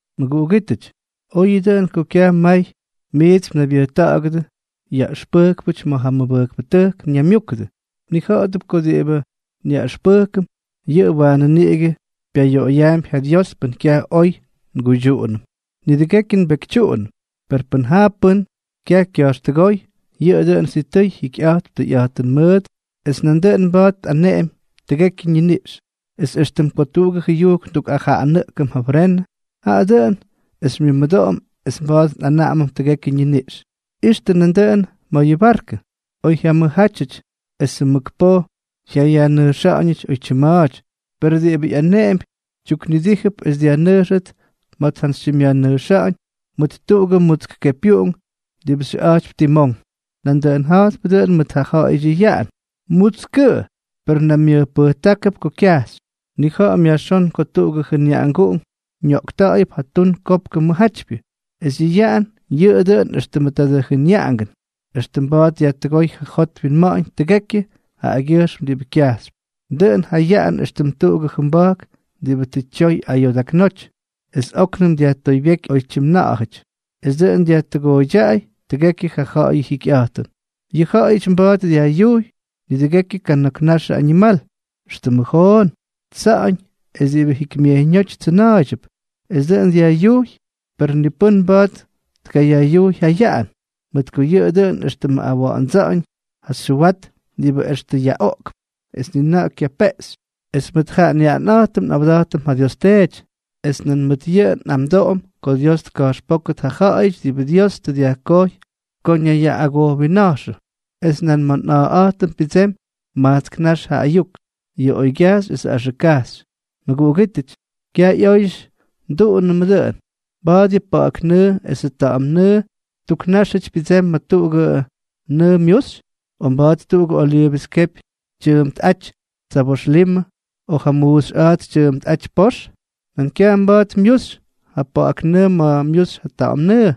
Mʉguꞌugítʉty, oyʉ dʉꞌʉn ko kyaj may miits mnaybyʉjta̱ꞌa̱gʉdʉ yaꞌʉxpʉjkpʉty ma̱ ja mʉbʉjkpʉtʉjk ñaymyúkʉdʉ. Mnija̱ꞌa̱dʉp ko diꞌibʉ nyaꞌʉxpʉjkʉm, yʉꞌʉ waanʉ niꞌigʉ pyayoꞌoyaampy ja Dios pʉn kyaj oy nguydyuꞌunʉm. Nidʉgekyʉ nbekytyuꞌunʉm; per pʉn jaa pʉ́n kyaj kya̱jxtʉgóy, yʉꞌʉ dʉꞌʉn sitʉy jikyꞌa̱jtp tʉyꞌa̱jtʉn mʉʉt es nandʉꞌʉn mba̱a̱t tꞌaneꞌemy tʉgekyʉ ñiniꞌx. Es éxtʉm ko tuꞌugʉ jʉyujk ndukꞌajaꞌanʉꞌkʉm ja frenʉ, jaꞌa dʉꞌʉn es xymyʉmʉdoꞌom es mba̱a̱t nꞌanaꞌamʉm tʉgekyʉ ñiniꞌx. Ixtʉ nandʉꞌʉn ma̱ yʉ barkʉ. Oy jyamʉjjátyʉty esʉ mʉk poj jyayajnʉjxa̱ꞌa̱ñʉty oytyim ma̱a̱ty, per diꞌibʉ ꞌyaneꞌempy tyuknidíjʉp es dyajnʉjxʉt ma̱ tjantsytyimꞌyajnʉjxa̱ꞌa̱ñ mʉt tuꞌugʉ mutsk kepyuꞌunk diꞌibʉ xyʉꞌa̱jtypy timón. Nandʉꞌʉn ja̱jtpʉ dʉꞌʉn mʉt ja ja̱ꞌa̱yʉty ja yaꞌan. Mutskʉꞌʉ, per naymyʉjpʉjtákʉp ko kyajxy. Nnija̱ꞌa̱m yajxón ko tuꞌugʉ jʉnyaꞌanguꞌunk ñoꞌkta̱ꞌa̱yʉp ja tun kopkʉ mʉjjátypyʉ. Es yʉ yaꞌan yʉꞌʉ dʉꞌʉn éxtʉmʉ tadʉ jʉnyaꞌanguꞌunk, extʉ mba̱a̱t dyajtʉgóy ja jot winma̱ꞌa̱ñ tʉgekyʉ jaꞌagyʉjxm diꞌibʉ kyajxypy. Dʉꞌʉn ja yaꞌan éxtʉm tuꞌugʉ jʉmba̱jk diꞌibʉ tʉ tyoy ayoodaknóty, es óknʉm dyajtoybyéky oytyim na̱ꞌa̱jʉty, es dʉꞌʉn dyajtʉgooydyaꞌay tʉgekyʉ ja ja̱ꞌa̱yʉ jyikyꞌa̱jtʉn. Yʉ ja̱ꞌa̱yʉty mba̱a̱t dyajꞌyujy nidʉgekyʉ kana̱k naxʉ añimal, éxtʉmʉ joon, tsa̱ꞌa̱ñ, es diꞌibʉ jikymyejyñóty tsʉna̱a̱ydyʉp, es tʉ dʉn dyajꞌyujy; per ni pʉ́n mba̱a̱t tkayajꞌyujy ja yaꞌan, mʉt ko yʉꞌʉ dʉꞌʉn éxtʉmʉ awa̱ꞌa̱ndsa̱ꞌa̱ñ ja xyʉwat diꞌibʉ extʉ yaꞌoꞌkp es ni na̱ꞌa̱ kyapeꞌxy. Es mʉt ja nyaꞌanꞌa̱jtʉm nꞌawda̱jtʉm ja Dios Teety, es nan mʉt yʉꞌʉ nꞌamdoꞌom ko Dios tka̱jxpókʉt ja ja̱ꞌa̱yʉty diꞌibʉ Dios tʉ dyajkojy ko ñayyaꞌꞌagojwinna̱jxʉ. Es nan ma̱ nꞌa̱a̱ꞌa̱jtʉm pyʉdsemy majtsk nax ja ayuk, yʉ oygyajxy esʉ axʉk kajxy. Mʉguꞌugítʉty, ¡kyaj ꞌyóyʉty nduꞌunʉmʉ dʉꞌʉn! ¿Mba̱a̱t yʉ pa̱ꞌa̱k nʉʉ esʉ ta̱ꞌa̱m nʉʉ tuk náxyʉty pyʉdsemy ma̱ tuꞌugʉ nʉʉ myuxy?, o ¿mba̱a̱t tuꞌugʉ oliivʉs kepy tyʉʉmpꞌáty tsabox limʉ, o ja muuxyꞌa̱a̱ts tyʉʉmpꞌáty pox? Nan kyaj mba̱a̱t myuxy ja pa̱ꞌa̱k nʉʉ ma̱ myuxy ja ta̱ꞌa̱m nʉʉ.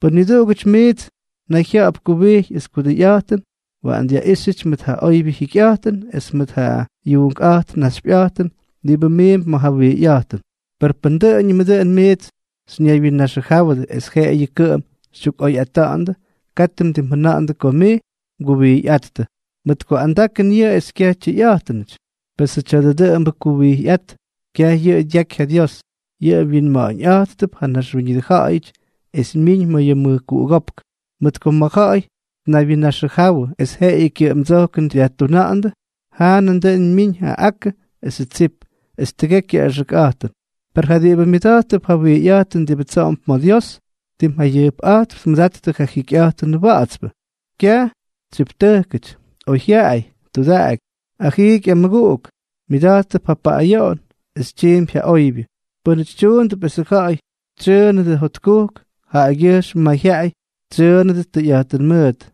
Pʉn niduꞌugʉty miits nayjya̱ꞌa̱p kuwijy es kudʉyꞌa̱jtʉn, waꞌan dyaꞌíxyʉty mʉt ja oybyʉ jikyꞌa̱jtʉn es mʉt ja yuunkꞌa̱jt naxypyʉꞌa̱jtʉn diꞌibʉ miimp ma̱ ja wijyꞌa̱jtʉn. Per pʉn dʉꞌʉñʉmʉ dʉꞌʉn miits xyñaywyinnaxʉjáwʉdʉ es jeꞌeyʉ kʉꞌʉm xytyukꞌoyꞌata̱ꞌa̱ndʉ, katʉ mdimjʉna̱ꞌa̱ndʉ ko mij mguwijyꞌáttʉ, mʉt ko andakʉn yʉꞌʉ es kyaj tyʉyꞌa̱jtʉnʉty. Pesʉ tya̱dʉ dʉꞌʉmbʉ kuwijyꞌát, kyaj yʉꞌʉ dyaky ja Dios. Yʉꞌʉ wyinma̱ꞌa̱ñꞌa̱jttʉp ja naxwíñʉdʉ ja̱ꞌa̱yʉty, es myiñ ma̱ yʉ mʉjkuꞌugópk. Mʉt ko ma̱ ja̱ꞌa̱y tnaywyinnaxʉjawʉ es jeꞌeyʉ kyʉꞌʉmdsojkʉn dyajtuna̱ꞌa̱ndʉ, jaa nandʉꞌʉn myiñ ja akʉ esʉ tsip, es tʉgekyʉ axʉkꞌa̱jtʉn; per ja diꞌibʉ myʉda̱jttʉp ja wijyꞌa̱jtʉn diꞌibʉ tsoꞌomp ma̱ Dios, tim jayʉjpꞌa̱jtp tmʉdattʉ ja jikyꞌa̱jtʉn wa̱ꞌa̱tspʉ, kyaj tsyiptʉjkʉty, oyjyaꞌay, tudaꞌaky, ajiiky amʉguꞌuk, myʉda̱jttʉp ja paꞌꞌayoꞌon, es tyiimpy ja oybyʉ. Pʉ́nʉty tyuundʉp esʉ ja̱ꞌa̱y tsyʉʉnʉdʉ jotkujk, jaꞌagyʉjxm mayjyaꞌay tsyʉʉnʉdʉt tʉyꞌa̱jtʉn mʉʉt.